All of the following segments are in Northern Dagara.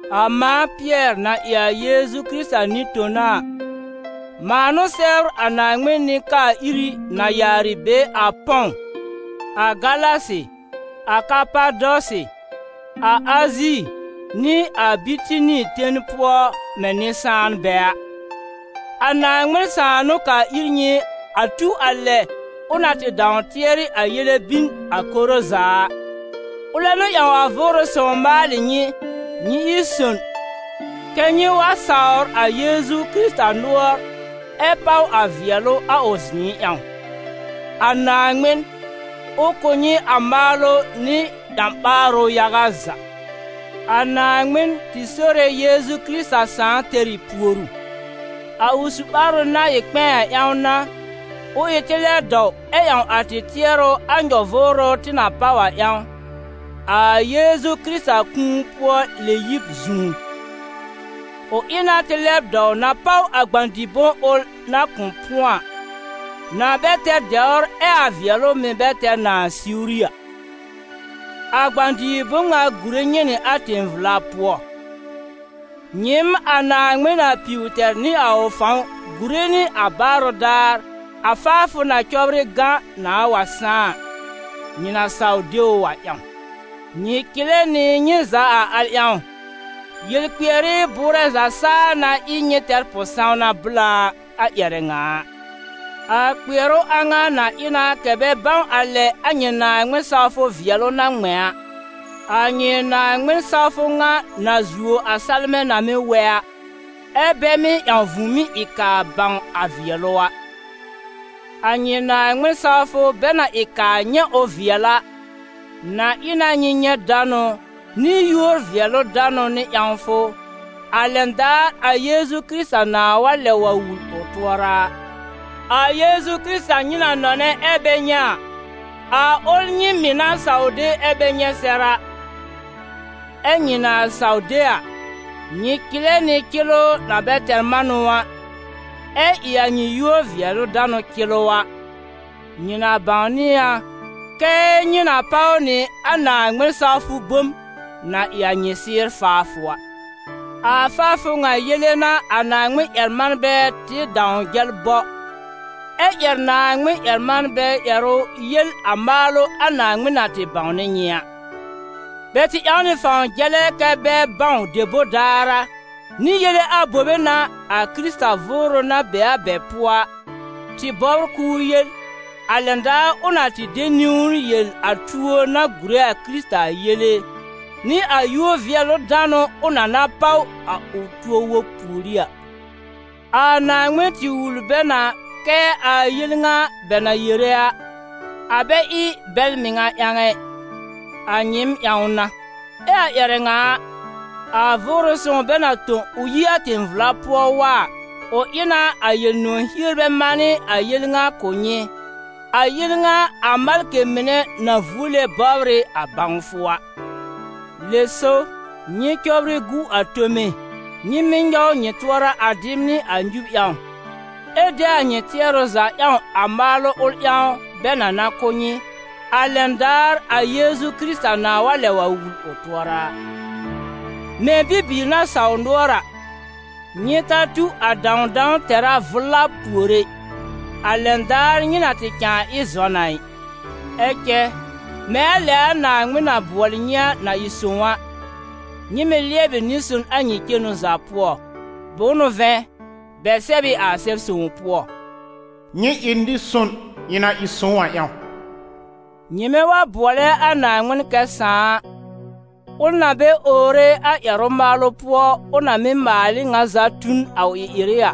A mãa Pɩɛr, na ɩ a Yeezu Kɩrɩta nɩ-tona a, mãa n'ʋ sɛbr a Naaŋmɩn nɩ-kaa-iri na yaarɩ be a Pɔ̃w, a Galasi, a Kapadɔsɩ, a Azi nɩ a Bitini ten pʋɔ mɛ̃ nɩ-sãanbɛ a. A Naaŋmɩn Sãà n'ʋ kaa ir nyɩ a tu a lɛ ʋ na tɩ dãw tɩɛrɩ a yele bin a koro za a; ʋlɛ n'ʋ ƴãw a Vʋʋrʋ Sõw maalɩ nyɩ, nyɩ ɩ son kɛ nyɩ wa sawr a Yeezu Kɩrɩta nʋɔr ɛ páw a vɩɛlʋ a ʋ zɩ̃ɩ ƴãw. A Naaŋmɩn, ʋ kʋ̀ nyɩ a maalʋ nɩ ƴã-ɓaarʋ yaga za. A Naaŋmɩn, tɩ Sore Yeezu Kɩrɩta Sãà, tɛr ɩ puoru. A ʋ su-ɓaarʋ na ɩ kpɛ̃ɛ a ƴãw n'a, ʋ ɩ tɩ lɛb dɔw ɛ ƴãw a tɩ tɩɛrʋ a nyɔ-vʋʋrʋ tɩ na páw a ƴãw, a Yeezu Kɩrɩta kũu-pʋɔ-lɛ-yib zũú. Ʋ ɩ na tɩ lɛb dɔw na páw a gbã-dɩ-bom ʋl na kʋ̃ pʋ̃ɔ a, na bɛ tɛr dɛwr ɛ a vɩɛlʋ mɩ̀ bɛ tɛr nãà siwri a. A gbã-dɩ-bom ŋa gùre nyɩ nɩ a tẽ-vla pʋɔ, nyɩɩm a Naaŋmɩn na piw tɛr nɩ a ʋ fãw gùre nɩ a baarʋ daar a faafʋ na cɔbrɩ gã nãà wa sãá a, nyɩ na saw de ʋ a ƴãw. Nyɩ̀ cɩlɛ nɩ nyɩ za a al ƴãw, yel-kpɩɛrɩ bʋʋrɛ za saa na ɩ nyɩ tɛr pʋ-sãwna blã a ƴɛrɛ ŋa a. A kpɩɛrʋ a ŋa na ɩ na kɛ̀ bɛ bãw a lɛ a nyɩ Naaŋmɩn-sawfʋ vɩɛlʋ na ŋmɛ̃ a, a nyɩ Naaŋmɩn-sawfʋ ŋa na zuo a salmɛ̃ na mɩ́ wɛ a, ɛ́ bɛ mɩ́ ƴãw vũùmí ɩ kaa bãw a vɩɛlʋ a. A nyɩ Naaŋmɩn-sawfʋ bɛ na ɩ kaa nyɛ̃ ʋ vɩɛl a, na ɩ na nyɩ nyɛ̃ danʋ, nɩ yúor-vɩɛlʋ-danʋ nɩ ƴãwfʋ, a lɛn daar a Yeezu Kɩrɩta nãà wa lɛb wa wul ʋ tʋɔra a, a Yeezu Kɩrɩta nyɩ na nɔnɛ ɛ bɛ nyɛ̃ a, a ʋl nyɩ mɩ̀ na saw de ɛ bɛ nyɛ̃ sɛr a. Ɛ́ nyɩ na saw de a, nyɩ cɩlɛ nɩ nʋ̃ɔ̀ cɩlʋ na bɛ tɛr manʋ a, ɛ ɩ a nyɩ yúor-vɩɛlʋ-danʋ cɩlʋ a, nyɩ na bãwnɩ a kɛ́ nyɩ na páw nɩ a Naaŋmɩn-sawfʋ bom na ɩ a nyɩ sɩ́ɩr faafʋ a. A faafʋ ŋa yele n'a a Naaŋmɩn-ƴɛr-manbɛ tɩ dãw jɛl bɔ, ɛ́ ƴɛr Naaŋmɩn-ƴɛr-manbɛ ƴɛrʋ yel a maalʋ a Naaŋmɩn na tɩ bãwnɩ nyɩ a. Bɛ tɩ ƴãw nɩ fãw jɛlɛ kɛ́ bɛ bãw debor daar a, nɩ yele abobe n'a, a Kɩrɩta Vʋʋrʋ na be a bɛ pʋɔ a, tɩ bɔbr k'ʋʋ yel, a lɛn daar ʋ na tɩ de niwn yel a tuo na gùre a Kɩrɩta a yele, nɩ a yúor-vɩɛlʋ-danʋ ʋ na na páw a tuo wob pùorí a. A Naaŋmɩn tɩ wul bɛ na kɛ a yel ŋa bɛ na tɩ yere a, a bɛ ɩ bɛl mɩŋa ƴãw ɛ, a nyɩɩm ƴãw n'a. Ɛ a ƴɛrɛ ŋa a, a Vʋʋrʋ Sõw bɛ na tõ ʋ yi a tẽ-vla pʋɔ wa a, ʋ ɩ na a Yel-nʋ̃ɔ̀ hierbɛ manɩ a yel ŋa kʋ̀ nyɩ, a yel ŋa a malkɩ mɩnɛ na vuole bɔbr ɩ a bãwfʋ a. Lɛ so, nyɩ cɔbrɩ gu a tome, nyɩ mɩ́ nyɔw nyɩ tʋɔra a dɩb nɩ a nyub ƴãw, ɛ de a nyɩ tɩɛrʋ za ƴãw a maalʋ ʋl ƴãw bɛ na na kʋ̀ nyɩ, a lɛn daar a Yeezu Kɩrɩta nãà wa lɛb wul ʋ tʋɔra a. Mɛ̃ bibiir na sawr nʋɔr a, nyɩ ta tu a dãwdãw tɛ̀rá vʋla pùor ɛ, a lɛn daar nyɩ na tɩ cãa ɩ zɔn a ɩ. Ɛ cɛ, mɛ̃ a lɛ a Naaŋmɩn na bʋɔlɩ nyɩ a, na ɩ sõw a, nyɩ mɩ̀ lɩɛbɩ nɩ-son a nyɩ cenu za pʋɔ. Bʋ̃ʋ n'ʋ vɛ̃, bɛ sɛb ɩ a Sɛb-sõw pʋɔ: «Nyɩ ɩ nɩ-son, ɩ̃ na ɩ sõw a ƴãw.» Nyɩmɛ wa bʋɔlɛ a Naaŋmɩn kɛ Sãà a, ʋl na bɛ owre a ƴɛrʋ-maalʋ pʋɔ, ʋ na mɩ́ maal ɩ ŋa za tu n a ʋ ɩ-ɩrɩ a,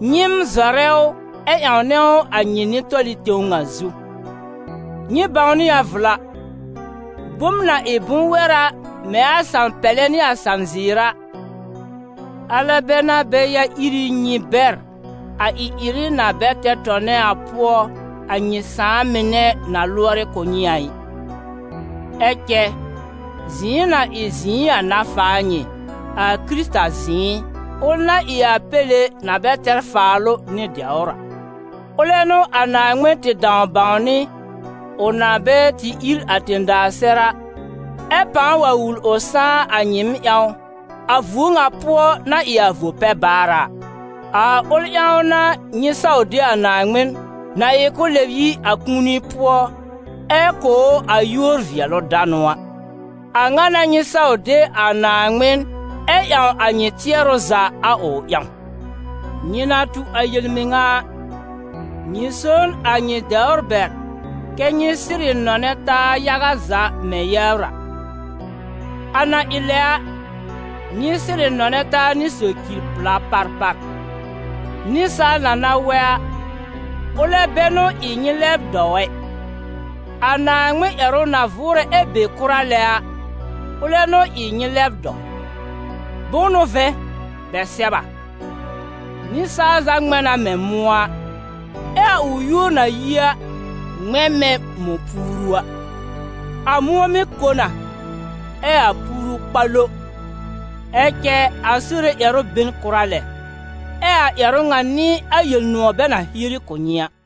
nyɩɩm zɔrɛ ʋ ɛ ƴãwnɛ ʋ a nyɩ nɩ-tɔlɩ tẽw ŋa zu. Nyɩ bãwnɩ a vla, bom na ɩ bʋ̃-wɛra mɛ̃ a salm-pɛlɛ nɩ a salm-zɩɩr a, alɛ bɛ n'a bɛ ya ír ɩ nyɩ bɛr a ɩ-ɩrɩ na bɛ tɛr tɔnɛ a pʋɔ, a nyɩ sãà mɩnɛ na lʋɔrɩ kʋ̀ nyɩ a ɩ. Ɛ cɛ zɩ̃ɩ na ɩ zɩ̃ɩ a n'a faa nyɩ, a Kɩrɩta zɩ̃ɩ, ʋl na ɩ a Péle na bɛ tɛr faalʋ nɩ dɛwr a. Ʋlɛ n'ʋ a Naaŋmɩn tɩ dãw bãwnɩ, ʋ na bɛ tɩ ír a tẽ-daa sɛr a, ɛ pãa wa wul ʋ sãá a nyɩɩm ƴãw, a vuo ŋa pʋɔ na ɩ a vo-pɛ-baar a. A ʋl ƴãw n'a nyɩ saw de a Naaŋmɩn, na ɩ k'ʋ lɛb yi a kũuni pʋɔ ɛ kʋ̀ ʋ a yúor-vɩɛlʋ-danʋ a. A ŋa n'a nyɩ saw de a Naaŋmɩn ɛ ƴãw a nyɩ tɩɛrʋ za a ʋ ƴãw. Nyɩ na tu a yel-mɩŋa a, nyɩ so n a nyɩ dɛwr bɛr kɛ́ nyɩ sɩrɩ nɔnɛ taa yaga za mɛ̃ yɛbr a. A na ɩ lɛ a, nyɩ sɩrɩ nɔnɛ taa nɩ socir-pla parpar. Nɩsaal na na wɛ a, ʋlɛ bɛ n'ʋ ɩ nyɩ lɛb dɔw ɛ, a Naaŋmɩn ƴɛrʋ na vʋʋrɛ ɛ be kʋra lɛ a, ʋlɛ n'ʋ ɩ nyɩ lɛb dɔw. Bʋ̃ʋ n'ʋ vɛ̃, bɛ sɛb a: «Nɩsaal za ŋmɛ̃ na mɛ̃ mʋ̃ɔ a, ɛ a ʋ yúor na yi a, ŋmɛ̃ mɛ̃ mɔ̃-puuru a: a mʋ̃ɔ mɩ́ ko na, ɛ a puuru kpa lo, ɛ cɛ a Sore ƴɛrʋ be n kʋra lɛ.» Ɛ a ƴɛrʋ ŋa n'ɩ a Yel-nʋ̃ɔ̀ bɛ na hieri kʋ̀ nyɩ a.